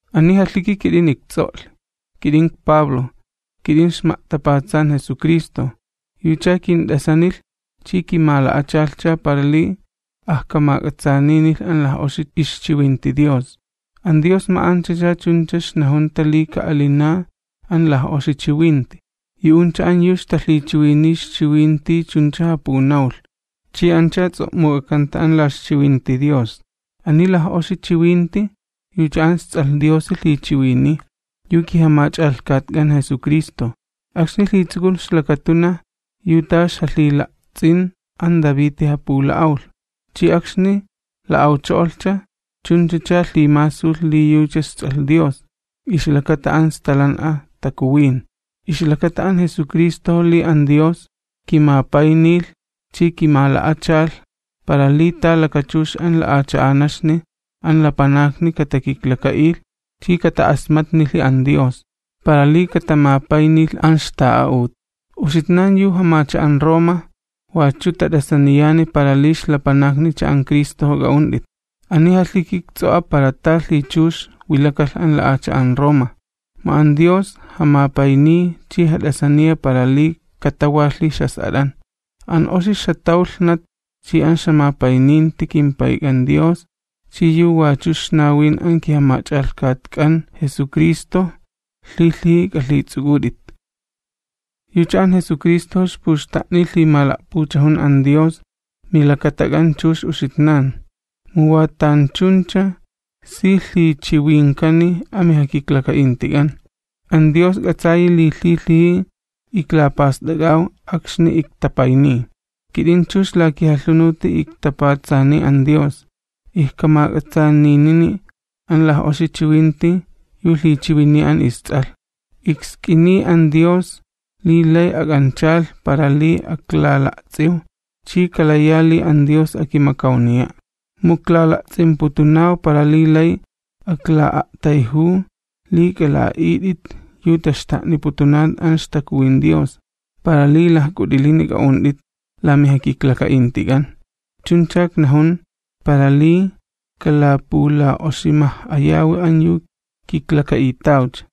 Ani jalhiki kit'ini ikts'o'lhi, kit'in ikPablo, kit'in ixma'tapatsan Jesucristo, yucha kint'asanilh chi kimala'achalhcha para li ajkamak'atsaaninilh an laj'oxi ixchiwinti Dios. An Dios ma'anchacha chunchacha ixnajunta li ka'alina an laj'oxi chiwinti. Yu'uncha an yu ixtalhichiwiniy ixchiwinti chuncha japunawlh, chi ancha ts'o'muk'akanta an la ixchiwinti Dios. Ani laj'oxi chiwinti yucha an isTs'alh Diosi lhichiwiniy, yu kiJamach'alhkatk'an Jesucristo. Akxni lhitsukulh ixlakatunaj, yu ta ixjalhila'ts'in an Daviti japula'awlh. Chi akxni la'awcho'olhcha, chunchacha lhimasulh li yucha isTs'alh Dios, ixlakata an Stalan'a Takuwin. Ixlakata an Jesucristojo li an Dios kimapaynilh chi kimala'achalh, para li ta kilhmakchux ta'alin an lapanakni katakiklaka'ilh chi kata'asmatnilhi an Dios, para li katamapaynilh an ixta'a'ut. Uxitnan yu jamacha'an Roma wachu tat'asaniyani para li ixlapanaknicha an Cristojo k'a'unt'it. Ani jalhiki ikts'o'a para ta lhichux wilakalh an la'acha'an Roma, mu an Dios jamapayniy chi jat'asaniya para li katawalhi ixjas'at'an. An oxi ixjatawlhnat chi an ixjamapayninti kimPayk'an Dios chi yu wachu ixnawin an kiJamach'alhkatk'an Jesucristo lhilhiji k'alhits'uk'ut'it. Yucha an Jesucristojo ikpuxta'niy lhimala'puchajun an Dios milakatak'an chux uxitnan, mu wa tanchuncha si lhichiwinkani amijakiklaka'intik'an. An Dios k'atsayi li lhilhiji iklapast'ak'aw akxni iktapayniy. Kit'in chux la kijalhunuti iktapatsaniy an Dios, ijkamak'atsaaninini an laj'oxi chiwinti yu lhichiwiniy an isTs'alh. Iksk'iniya an Dios li lay ak'anchalh para li aklala'ts'iw, chi kalaya li an Dios akimakawniya'. Mu iklala'ts'imputunaw para li lay akla'a'tayjuw, li k'ala'a'it'it yu taxta'niputunan an ixTakuwin Dios, para li lajk'ut'ilini k'a'unt'it la mijakiklaka'intik'an. Chuncha iknajun, para li kalapula'oximaj'ayawi an yu kiklaka'itawcha.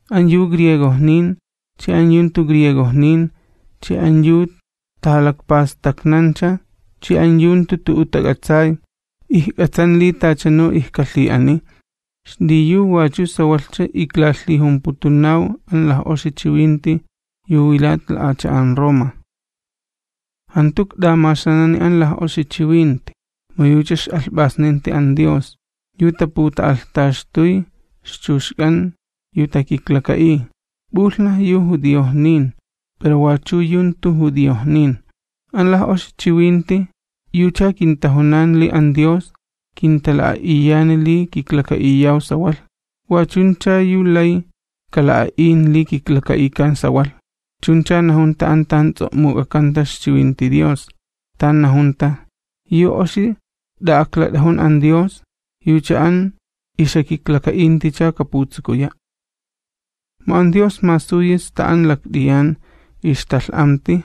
An yu griegojnin chi an yu jantu griegojnin, chi an yu tajalakpastaknancha chi an yu jantu tu'u tak'atsay, ijk'atsan li tachanu ijkalhi'aniy, xliyu wachu sawalhcha iklajumputunaw an laj'oxi chiwinti yu wilat la'acha'an Roma. Jantu ikt'amaxanani an laj'oxi chiwinti, mu yucha ix'alhp'asninti an Dios, yu taputa'alhtaxtuy ixchuxk'an yu takiklaka'iy. P'ulhnaj yu judiojnin pero wachu yu jantu judiojnin. An laj'oxi chiwinti yucha kintajunan li an Dios kintala'a'iyani li kiklaka'iyaw sawalh, wa chuncha yu lay kala'a'in li kiklaka'ikan sawalh. Chuncha najunta an tan ts'o'muk'akanta ixchiwinti Dios, tan najunta: “Yu oxi t'a'aklat'ajun an Dios yucha an ixjakiklaka'inticha kaputsukuya'.” Mu an Dios masuyi sta an lakt'iyan ixtalh'amti,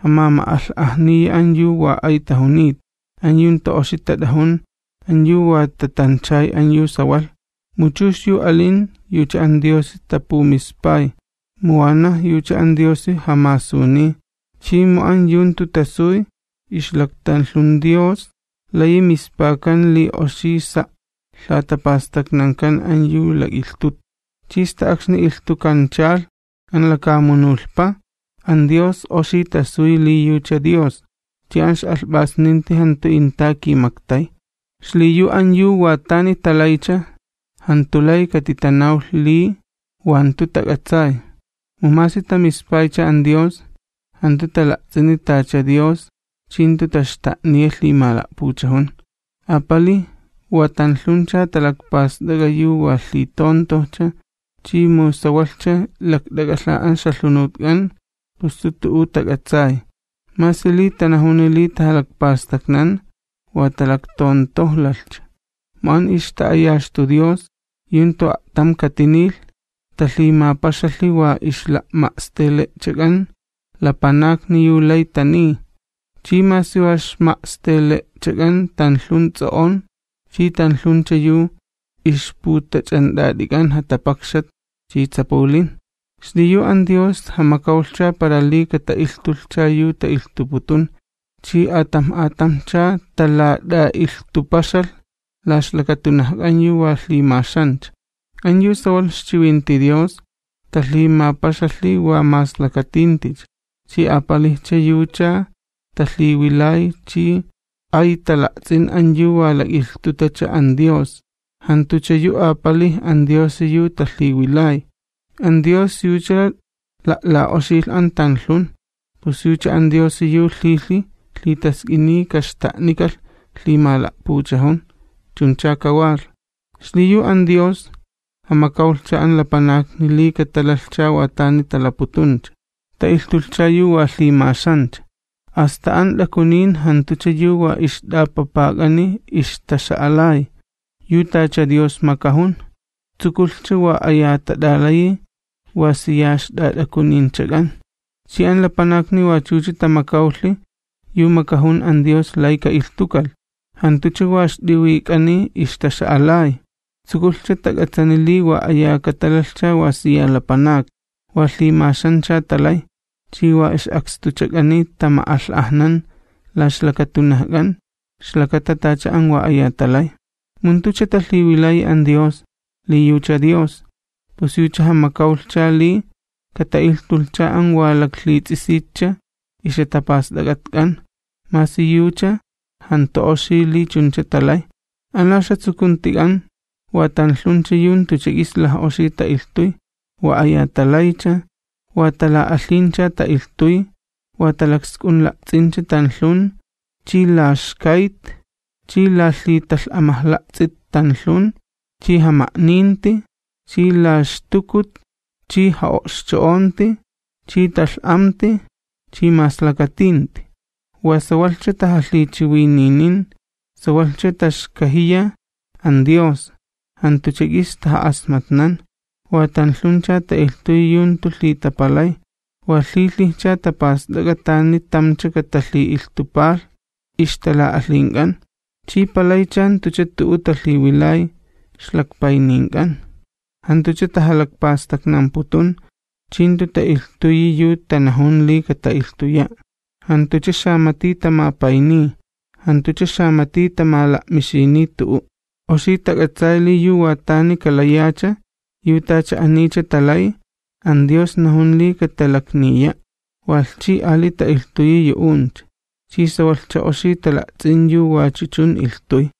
jamama'alh'ajniya an yu wa ay tajunita, an yu jantu oxi tat'ajun, an yu wa tatanchay an yu sawalh. Mu chux yu alin yucha an Diosi tapumispay, mu wanaj yucha an Diosi jamasuniy. Chi mu an yu jantu tasuy ixlaktanlhun Dios layi mispakan li oxi sa' lhatapastaknankan an yu lak'ilhtuta. Chi sta akxni ilhtukanchalh an lakamunulhpa an Dios oxi tasuy li yucha Dios, chi an ix'alhp'asninti jantu inta kimaktay. Xliyu an yu wa tani talaycha, jantu lay katitanawlh li wa jantu tak'atsay. Mu masi tamispaycha an Dios, jantu tala'ts'ini tacha Dios chi jantu taxta'niya lhimala'puchajun. Apalij wa tanlhuncha talakpast'ak'a yu wa lhitontojcha chi mu sawalhcha lakt'ak'alha an ixjalhunutk'an pus jantu tu'u tak'atsay. Masi li tanajuni li tajalakpastaknan, wa talaktontojlalhcha. Mu an ixta'ayaxtu Dios yu jantu a'tam katinilh, talhimapaxalhi wa ixla'ma'stele'chak'an lapanakni yu lay taniy, chi masi wa ixma'stele'chak'an tanlhun ts'o'on chi tanlhuncha yu ixputach'ant'at'ik'an jatapakxat chi ts'apulin. Xliyu an Dios jamakawlhcha para li kata'ilhtulhcha yu ta'ilhtuputun, chi atamj atamjcha talat'a'ilhtupaxalh la ixlakatunajk'an yu wa lhimaxancha. An yu sawalh ixchiwinti Dios talhimapaxalhi wa maslakatinticha. Chi apalijcha yucha talhiwilay chi ay tala'ts'in an yu wa lak'ilhtutacha an Dios, jantucha yu apalij an Diosi yu talhiwilay. An Dios yucha la'la'oxilh an tanlhun, pus yucha an Diosi yu lhilhij lhitask'iniy kaxta'nikalh lhimala'puchajun. Chuncha kajunlhi. Xliyu an Dios jamakawlhcha an lapanakni li katalalhcha wa tani talaputuncha, ta'ilhtulhcha yu wa lhimaxancha, asta an t'akunin jantucha yu wa ixt'apapak'ani ixtaxa'alay, yu tacha Dios makajun, tsukulhcha wa aya tat'alayi wa siya ixt'at'akuninchak'an. Chi an lapanakni wachucha tamakawlhi yu makajun an Dios lay ka'ilhtukalh, jantucha wa ixt'iwik'ani ixtaxa'alay, tsukulhcha tak'atsani li wa aya katalalhcha wa siya lapanakni. Wa lhimaxancha talay, chi wa ix'akstuchak'ani tama'alh'ajnan la ixlakatunajk'an ixlakata tacha an wa aya talay. Mu jantucha talhiwilayi an Dios li yucha Dios, pus yucha jamakawlhcha li kata'ilhtulhcha an wa laklhits'isitcha ixjatapast'ak'atk'an masi yucha jantu oxi li chuncha talay. An la ixjatsukuntik'an wa tanlhuncha yu jantucha k'is laj'oxi ta'ilhtuy, wa aya talaycha, wa tala'alhincha ta'ilhtuy, wa talaksk'unla'ts'incha tanlhun chi laxkayt chi lalhitalh'amajla'ts'it tanlhun chi jama'ninti chi laxtukut chi ja'o'xcho'onti chi talh'amti chi maslakatinti. Wa sawalhcha tajalhichiwininin, sawalhcha taxkajiya an Dios, jantucha k'is taja'asmatnan, wa tanlhuncha ta'ilhtuy yu jantu lhitapalay, wa lhilhijcha tapast'ak'a tani tamcha katalhi'ilhtupalh ixtala'alhink'an, chi palaycha jantucha tu'u talhiwilay ixlakpaynink'an. Jantucha tajalakpastaknamputun, chi jantu ta'ilhtuyi yu tanajun li kata'ilhtuya', jantucha xamati tamapayniy, jantucha xamati tamala'mixiniy tu'u'. Oxi tak'atsay li yu wa tani kalayacha, yu tacha anicha talay, an Dios najun li katalakniya', walh chi ali ta'ilhtuyi yu'uncha, chi sawalhcha oxi tala'ts'in yu wachu chun ilhtuy.